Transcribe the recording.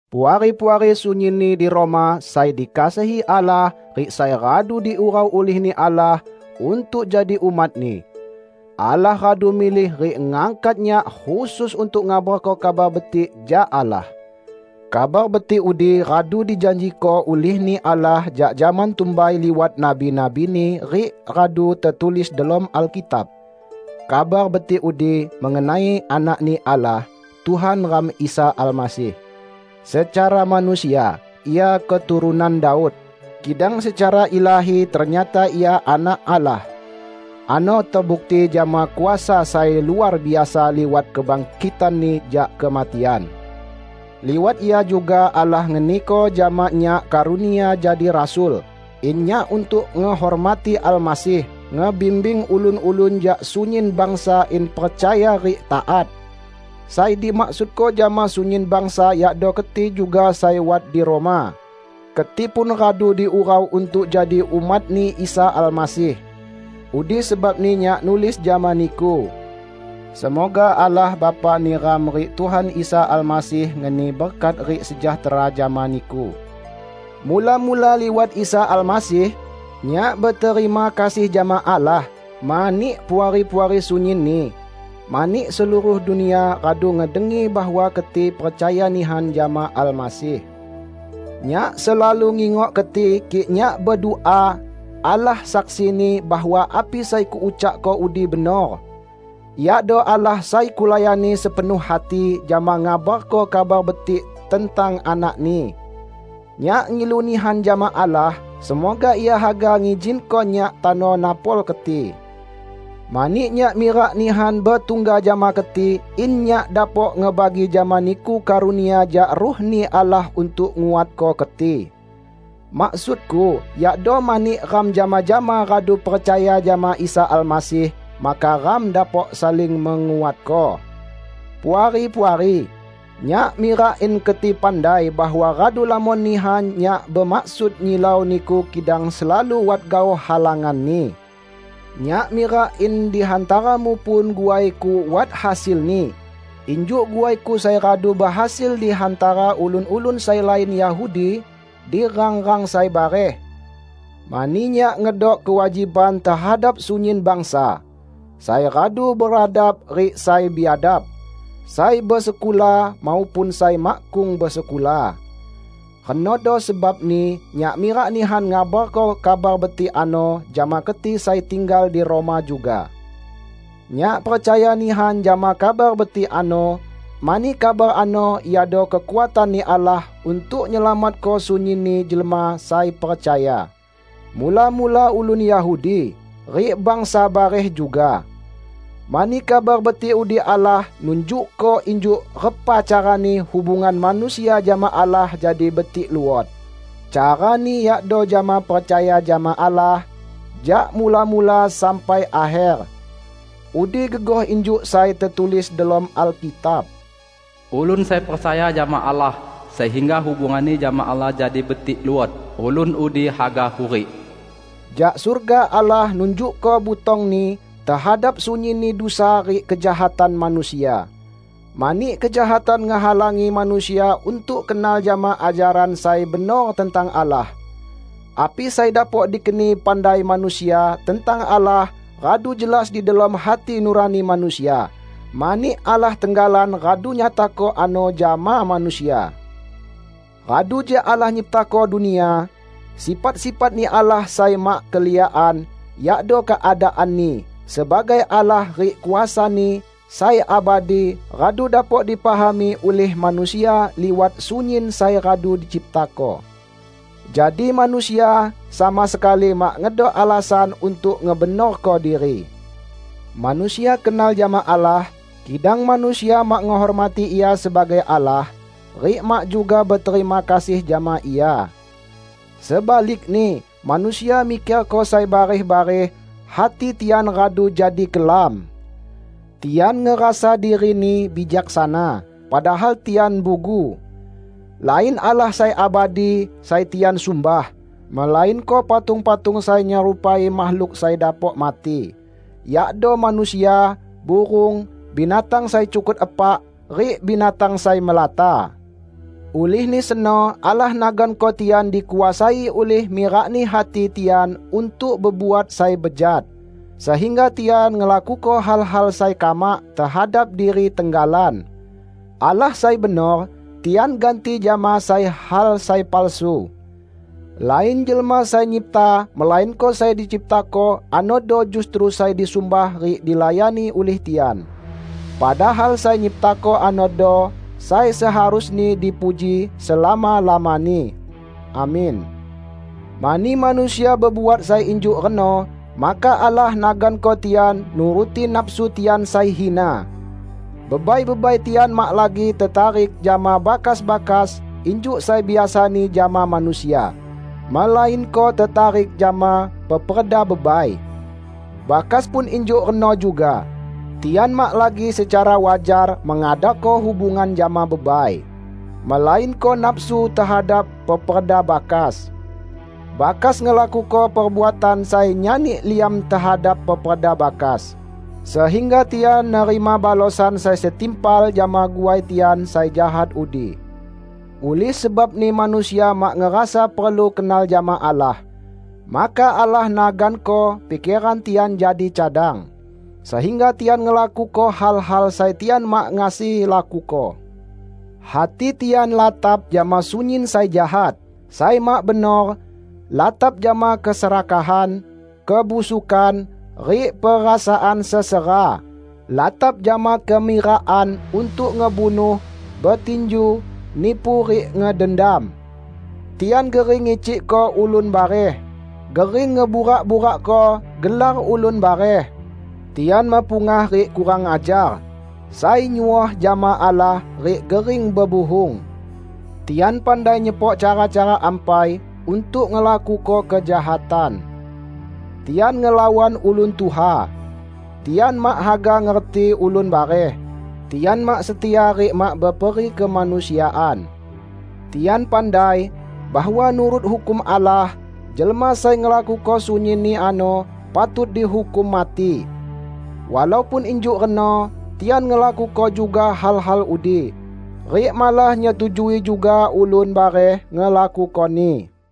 Puari-puari sunyinni di Roma sai dikasihi Allah rik sai radu diurau ulih-Ni Allah untuk jadi umat-Ni. Allah radu milih rik ngangkat nyak khusus untuk ngabarko Kabar Betik jak Allah. Kabar Betik udi radu dijanjiko ulih-Ni Allah jak zaman tumbai liwat nabi-nabi-Ni rik radu tetulis delom Alkitab. Kabar Betik udi mengenai Anak-Ni Allah, Tuhan ram Isa Almasih. Secara manusia, Ia keturunan Daud, kidang secara ilahi ternyata Ia Anak Allah. Ano tebukti jama kuasa sai luar biasa liwat kebangkitan-Ni jak kematian. Liwat Ia juga Allah ngeniko jama nyak karunia jadi rasul, in nyak -- untuk ngehormati Almasih -- ngebimbing ulun-ulun jak sunyin bangsa in percaya rik taat. Sai dimaksudko jama sunyin bangsa yakdo keti juga sai wat di Roma; keti pun radu diurau untuk jadi umat-Ni Isa Almasih. Udi sebabni nyak nulis jama niku. Semoga Allah Bapa neram rik Tuhan Isa Almasih ngeni berkat rik sejahtera jama niku. Mula-mula liwat Isa Almasih, nyak beterima kasih jama Allah mani Puari-puari sunyinni; mani seluruh dunia radu ngedengi bahwa keti percaya nihan jama Almasih. Nyak selalu ngingok keti kik nyak bedua. Allah saksini bahwa api sai kuucakko udi benor. Iado Allah sai kulayani sepenuh hati jama ngabarko Kabar Betik tentang Anak-Ni. Nyak ngilu nihan jama Allah, semoga Ia haga ngizinko nyak tano napol keti. Mani nyak mirak nihan betungga jama keti in nyak dapok ngebagi jama niku karunia jak Ruh-Ni Allah untuk nguatko keti. Maksudku yakdo mani ram jama-jama radu percaya jama Isa Almasih, maka ram dapok saling menguatko. Puari-puari! Nyak mirak in keti pandai bahwa radu lamon nihan nyak bemaksud nyilau niku kidang selalu wat gaoh halanganni. Nyak mirak in di hantaramu pun guaiku wat hasilni injuk guaiku sai radu behasil di hantara ulun-ulun sai lain Yahudi di rang-rang sai bareh. Mani nyak ngedok kewajiban tehadap sunyin bangsa: sai radu beradab rik sai biadab, sai besekula maupun sai makkung besekula. Renodo sebabni nyak mirak nihan ngabarko Kabar Betik ano jama keti sai tinggal di Roma juga. Nyak percaya nihan jama Kabar Betik ano, mani kabar ano iado kekuatan-Ni Allah untuk nyelamatko sunyinni jelma sai percaya; mula-mula ulun Yahudi, rik bangsa bareh juga. Mani Kabar Betik udi Allah nunjukko injuk repa carani hubungan manusia jama Allah jadi betik luot; carani yakdo jama percaya jama Allah, jak mula-mula sampai akher. Udi gegoh injuk sai tetulis delom Alkitab, "Ulun sai percaya jama Allah sehingga hubunganni jama Allah jadi betik luot, ulun udi haga hurik!" Jak surga Allah nunjukko butong-Ni tehadap sunyinni dusa rik kejahatan manusia, mani kejahatan ngehalangi manusia untuk kenal jama ajaran sai benor tentang Allah. Api sai dapok dikeni pandai manusia tentang Allah radu jelas di delom hati nurani manusia, mani Allah tenggalan radu nyatako ano jama manusia. Radu jak Allah nyiptako dunia, sifat-sifat-Ni Allah sai mak keliakan, yakdo keadaan-Ni sebagai Allah rik kuasa-Ni sai abadi radu dapok dipahami ulih manusia liwat sunyin sai radu diciptako. Jadi manusia sama sekali mak ngedok alasan untuk ngebenorko diri. Manusia kenal jama Allah, kidang manusia mak ngehormati Ia sebagai Allah rik mak juga beterima kasih jama Ia. Sebalikni manusia mikerko sai bareh-bareh; hati tian radu jadi kelam. Tian ngerasa dirini bijaksana, padahal tian bugu. Lain Allah sai abadi sai tian sumbah, melainko patung-patung sai nyerupai makhluk sai dapok mati; yakdo manusia, burung, binatang sai cukut epak, rik binatang sai melata. Ulihni seno Allah naganko tian dikuasai ulih mirakni hati tian untuk bebuat sai bejat, sehingga tian ngelakuko hal-hal sai kamak tehadap diri tenggalan. Allah sai benor, tian ganti jama sai hal sai palsu. Lain Jelma Sai Nyipta melainko sai diciptako anodo justru sai disumbah rik dilayani ulih tian. Padahal sai nyiptako anodo sai seharusni dipuji selama-lamani! Amin. Mani manusia bebuat sai injuk reno, maka Allah naganko tian nuruti nafsu tian sai hina. Bebai-bebai tian mak lagi tetarik jama bakas-bakas injuk sai biasani jama manusia, melainko tetarik jama peperda bebai. Bakas pun injuk reno juga; tian mak lagi secara wajar mengadako hubungan jama bebai, melainko nafsu tehadap peperda bakas. Bakas ngelakuko perbuatan sai nyani liam tehadap peperda bakas, sehingga tian nerima balosan sai setimpal jama guai tian sai jahat udi. Ulih sebabni manusia mak ngerasa perlu kenal jama Allah, maka Allah naganko pikeran tian jadi cadang, sehingga tian ngelakuko hal-hal sai tian mak ngasi lakuko. Hati tian latap jama sunyin sai jahat, sai mak benor; latap jama keserakahan, kebusukan, rik perasaan sesera; latap jama kemirakan untuk ngebunuh, betinju, nipu rik ngedendam. Tian gering ngicikko ulun bareh, gering ngeburak-burakko gelar ulun bareh; tian mepungah rik kurang ajar, sai nyuoh jama Allah rik gering bebuhung. Tian pandai nyepok cara-cara ampai untuk ngelakuko kejahatan. Tian ngelawan ulun tuha; tian mak haga ngerti ulun bareh; tian mak setia rik mak beperikemanusiaan. Tian pandai, bahwa nurut hukum Allah, jelma sai ngelakuko sunyinni ano patut dihukum mati. Walaupun injuk reno tian ngelakuko juga hal-hal udi; rik malah nyetujui juga ulun bareh ngelakukoni.